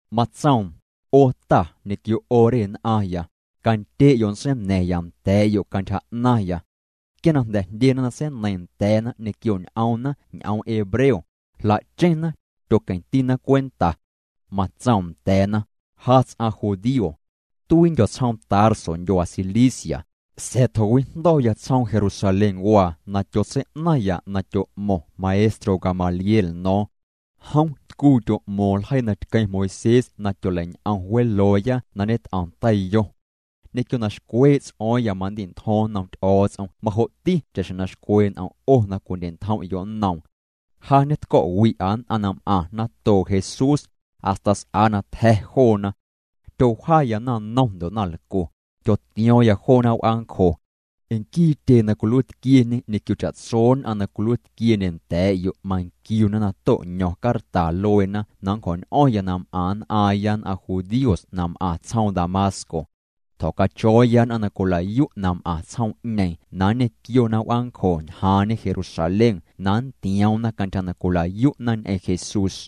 Matsoom: —'O ta ñequio 'o re nn'aⁿya, candye'yo' nntseina̱ⁿya nda̱a̱'yo' cantyja 'naⁿya. Quia na jndyena na seineiiⁿ nda̱a̱na ñequio ñ'oomna ñ'oom hebreo, jla'cheⁿna, tyoqueⁿtina cwenta. Matsoom nda̱a̱na: —Ja ts'aⁿ judío. Tuiindyo̱ tsjoom Tarso ndyuaa Cilicia, sa̱a̱ tjo̱wijndo̱ya tsjoom Jerusalénwaa na tyotsei'naⁿya na tyo'mo̱ⁿ maestro Gamaliel no̱o̱ⁿ. Jom tcuu tyo'mo̱o̱ⁿ ljeii na tqueⁿ Moisés na tyoleiñ'om welooya na ñet'om teiyo. Ñequio na xcwee' ts'o̱o̱ⁿya mandi'ntjo̱ⁿ nnom Ty'o̱o̱ts'om majo'ti cha'xjeⁿ na xcwee' n'om' 'o na cwindye'ntjom'yo' nnoom. Ja ñetco̱'wi'a nn'aⁿ na m'aⁿ natoo' Jesús, hasta s'a na tja̱ joona. Tyowjaya naⁿnom ndo' naⁿlcu, tyotio̱o̱ⁿya joona w'aancjo. Nquii tyee na cwiluiitquieñe ñequio cha'tso nn'aⁿ na cwiluiitquiendye nda̱a̱'yo' manquiuna na to'ño̱ⁿ carta lueena na nncjo̱ñ'o̱ⁿya na m'aⁿ nn'aaⁿya nn'aⁿ judíos na m'aⁿ tsjoom Damasco. Tjo̱cacho̱o̱ya nn'aⁿ na cwila'yu' na m'aⁿ tsjoom'ñeeⁿ na nñequiona w'aancjo ñjaaⁿñe Jerusalén na nntioomna cantyja na cwila'yu'na ñ'eⁿ Jesús.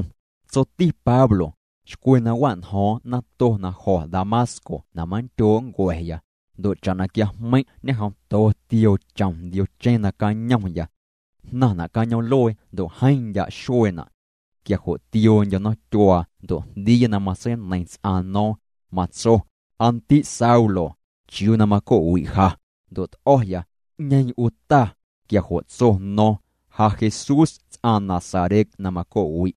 Tsoti Pablo: —Xcwe na wa'njo̱o̱ⁿ nato na jo̱ Damasco na manndyoo' nncua̱ya, ndo' cha'na quiajmeiⁿ' ñejomto tioo chom ndiocheⁿ nacañomya. Jnaⁿna' cañoom'luee ndo' jeeⁿ ndya' xueena'. Quia jo' tioondyo̱ nomtyuaa ndo' jndiiya na matseineiⁿ ts'aⁿ no̱o̱ⁿ, matso: “Aa ndi' Saulo, ¿chiuu na maco'wi' ja?” Ndo' t'o̱ya: “¿'Ñeeⁿ 'u Ta?” Quia jo' tso no̱o̱ⁿ: “Ja Jesús ts'aⁿ Nazaret na maco'wi'.”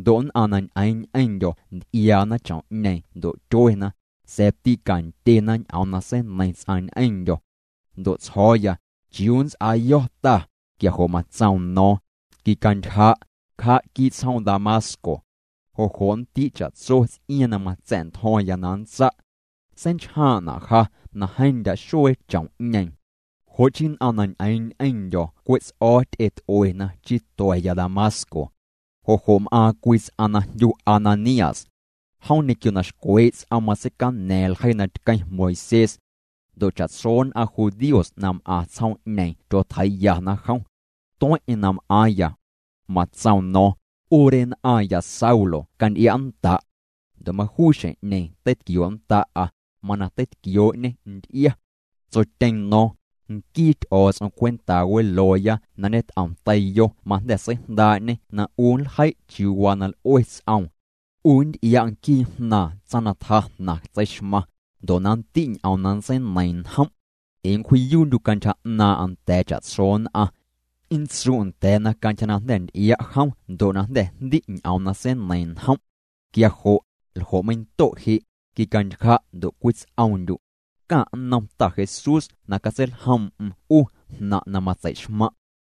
Ndo' nn'aⁿ na ñ'eeⁿ ñ'eⁿndyo̱ nty'iaana chom'ñeeⁿ ndo' tyuena, sa̱a̱ tîcandyena ñ'oom na seineiⁿ ts'aⁿ ñ'eⁿndyo̱. Ndo' tsjo̱o̱ya: “¿Chiuu nnts'aayo̱ Ta?” Quia jo' matsoom no̱o̱ⁿ: “Quicantyja', cja' quii' tsjoom Damasco. Jo' jo' nndi' cha'tso ts'iaaⁿ na matsa̱'ntjo̱ⁿya na nntsa'.” Seinchjaaⁿ'na' ja na jeeⁿ ndya' xuee chom'ñeeⁿ. Jo' chii nn'aⁿ na ñ'eeⁿ ñ'eⁿndyo̱ cwe' ts'o̱o̱ ty'et'uena chii tua̱ya Damasco. ’Jo' jo' m'aaⁿ cwii ts'aⁿ na jndyu Ananías. Jom ñequio na xcwee' ts'oom matseicana̱a̱ⁿ ljeii na tqueⁿ Moisés. Ndo' cha'tso nn'aⁿ judíos na m'aⁿ tsjoom'ñeeⁿ tyotjeii'yana jom. Tueⁿ'eⁿ na m'aaⁿya. Matsoom no̱o̱ⁿ: “'U re nn'aⁿya Saulo canty'ia'nnda'.” Ndo' majuu xjeⁿ'ñeeⁿ teitquionnda'a, mana teitquioo'ñê nty'ia. Tsotyeeⁿ no̱o̱ⁿ: “Nquii Ty'o̱o̱ts'om cwentaa welooya na ñet'om teiyo majnda̱ seijndaa'ñê na 'u nljei' chiuu waa na l'ue ts'oom. 'U nnty'ia' nquii Jnaaⁿ tsaⁿ na tja jnaⁿ tseixmaⁿ, ndo' na nndi' ñ'oom na nntseineiiⁿ njom'. Ee nncwji'yuu'ndyu' cantyja 'naaⁿ'aⁿ nda̱a̱ cha'tso nn'aⁿ. Nntsu' nda̱a̱na cantyja na jnda̱ nty'ia' jom ndo' na jnda̱ jndi' ñ'oom na seineiiⁿ njom'. Quia jo' ¿ljo' meindo' je'? Quicantyja' ndo' cwits'oomndyu'. Caⁿ' nnom Ta Jesús na catseiljoom'm 'u jnaⁿ' na matsei'xmaⁿ'.”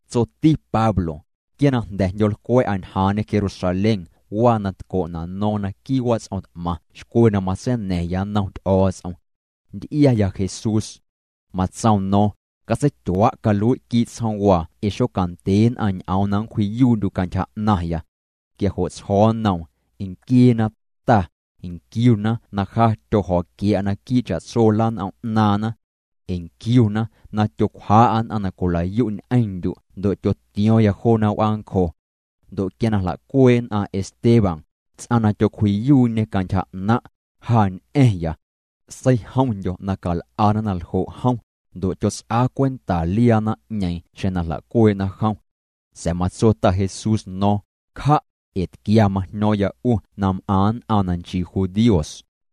Tsoti Pablo: —Quia na jnda̱ jndyo̱o̱lcwa̱'a ñjaaⁿñe Jerusalén waa na tco'na' no̱o̱ⁿ naquii' wats'om t'maⁿ xcwe na matseina̱ⁿya nnom Ty'o̱o̱ts'om. Nty'iaya Jesús. Matsoom no̱o̱ⁿ: “Catseityua' calui' quii' tsjoomwaa ee xocandye nn'aⁿ ñ'oom na nncwji'yuu'ndyu' cantyja 'naⁿya.” Quia jo' tsjo̱o̱ nnoom: “Nquieena, Ta, nquiuna na ja tyojo̱quia̱'a naquii' cha'tso lan'om 'naaⁿna. Nquiuna na tyocwjaa'a nn'aⁿ na cwila'yu' ñ'eⁿndyu' ndo' tyotio̱o̱ⁿya joona w'aancjo. Ndo' quia na jla'cuee' nn'aⁿ Esteban, ts'aⁿ na tyocwji'yuu'ñe cantyja 'naⁿ', ja ñ'a̱ⁿya. Seijomndyo̱ na cal'ana na ljo' jom, ndo' tyots'aa cwenta liaa naⁿ'ñeeⁿ xjeⁿ na jla'cuee'na jom.” Sa̱a̱ matso Ta Jesús no̱o̱ⁿ: “Cja', ee tquia majño̱o̱ⁿya 'u na m'aⁿ nn'aⁿ na nchii judíos.”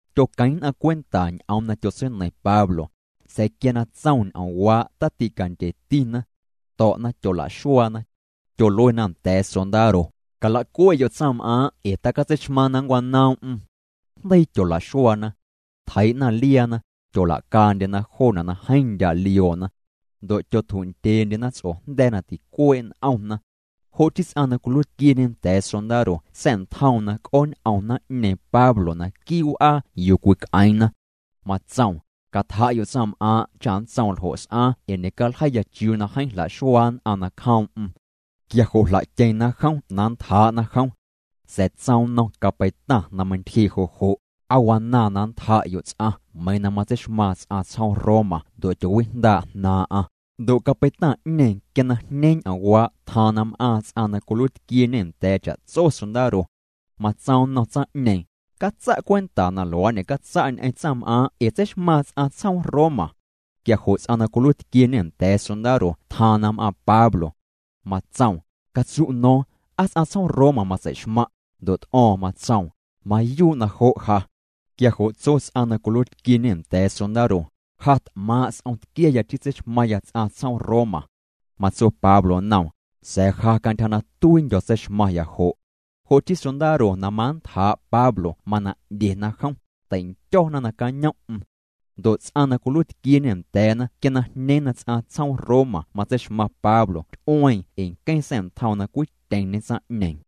Tyotqueⁿ nn'aⁿ cwenta ñ'oom na tyotseineiⁿ Pablo, sa̱a̱ quia na tsoom ñ'oomwaa' taticandyetina. To̱'na tyolaxuaana. Tyoluena nda̱a̱ sondaro: —Calacue'yo' tsaⁿm'aaⁿ ee tacatseixmaaⁿ na nncwanoom'm. Jndeii tyola'xuaana. Tjeii'na liaana, tyola'caandyena joona' na jeeⁿ ndya' lioona. Ndo' tyotju'ndyeendyena ts'ojnda̱a̱ na ticuee' n'omna. Jo' chii ts'aⁿ na cwiluiitquieñe nda̱a̱ sondaro sa̱'ntjoom na c'ooñ'om naⁿ'ñeeⁿ Pablo naquii' w'aa yuu cwic'eeⁿna. Matsoom: —Catja'yo' tsaⁿm'aaⁿ' cha nntsoom ljo' s'aaⁿ ee ñe'caljeiiya chiuu na jeeⁿ jla'xuaa nn'aⁿ nacjoom'm. Quia jo' jla'tyeⁿna jom na nntjaa'na jom. Sa̱a̱ tsoom nnom capeitaⁿ na meintyjee' jo' jo': —¿Aa wanaaⁿ na nntja'yo' ts'aⁿ meiiⁿ na matseixmaaⁿ ts'aⁿ tsjoom Roma ndo' tyoowijndaa' jnaaⁿ'aⁿ? Ndo' capeitaⁿ'ñeeⁿ quia na jñeeⁿ ñ'oomwaa' tjaaⁿ na m'aaⁿ ts'aⁿ na cwiluiitquieñe nda̱a̱ cha'tso sondaro. Matsoom nnom tsaⁿ'ñeeⁿ: —Catsa' cwenta na luaa' ñe'catsa' ñ'eⁿ tsaⁿm'aaⁿ' ee tseixmaaⁿ ts'aⁿ tsjoom Roma. Quia jo' ts'aⁿ na cwiluiitquieñe nda̱a̱ sondaro tjaaⁿ na m'aaⁿ Pablo. Matsoom: —Catsu' no̱o̱ⁿ ¿aa ts'aⁿ tsjoom Roma matsei'xmaⁿ'? Ndo' t'o̱o̱ⁿ matsoom: —Mayuu' na jo' ja. Quia jo' tso ts'aⁿ na cwiluiitquieñe nda̱a̱ sondaro: —Ja t'maaⁿ' s'om tquiaya chii tseixmaⁿya ts'aⁿ tsjoom Roma. Matso Pablo nnom: —Sa̱a̱ ja cantyja na tuiindyo̱ tseixmaⁿya jo'. Jo' chii sondaro na manntjaa' Pablo mana 'ndyena jom, tei'ndyo̱na nacañom'm. Ndo' ts'aⁿ na cwiluiitquieñe nda̱a̱na quia na jñeeⁿ na ts'aⁿ tsjoom Roma matseixmaⁿ Pablo ty'ueeⁿ ee nqueⁿ sa̱'ntjoom na cwityeⁿñe tsaⁿ'ñeeⁿ.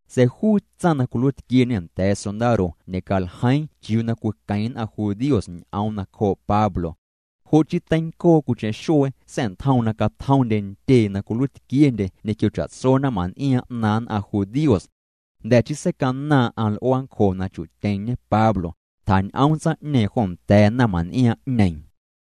Sa̱a̱ juu tsaⁿ na cwiluiitquieñe nda̱a̱ sondaro ñe'caljeiiⁿ chiuu na cwiqueⁿ nn'aⁿ judíos ñ'oom nacjoo' Pablo. Jo' chii teincoo cwiicheⁿ xuee sa̱'ntjoom na catjomndye ntyee na cwiluiitquiendye ñequio cha'tso naⁿmaⁿn'iaaⁿ 'naaⁿ nn'aⁿ judíos. Jnda̱ chii seicanaaⁿ'aⁿ l'uaancjo na chu'tyeⁿñe Pablo, tjañ'oom tsaⁿ'ñeeⁿ jo nda̱a̱ naⁿmaⁿn'iaaⁿ'ñeeⁿ.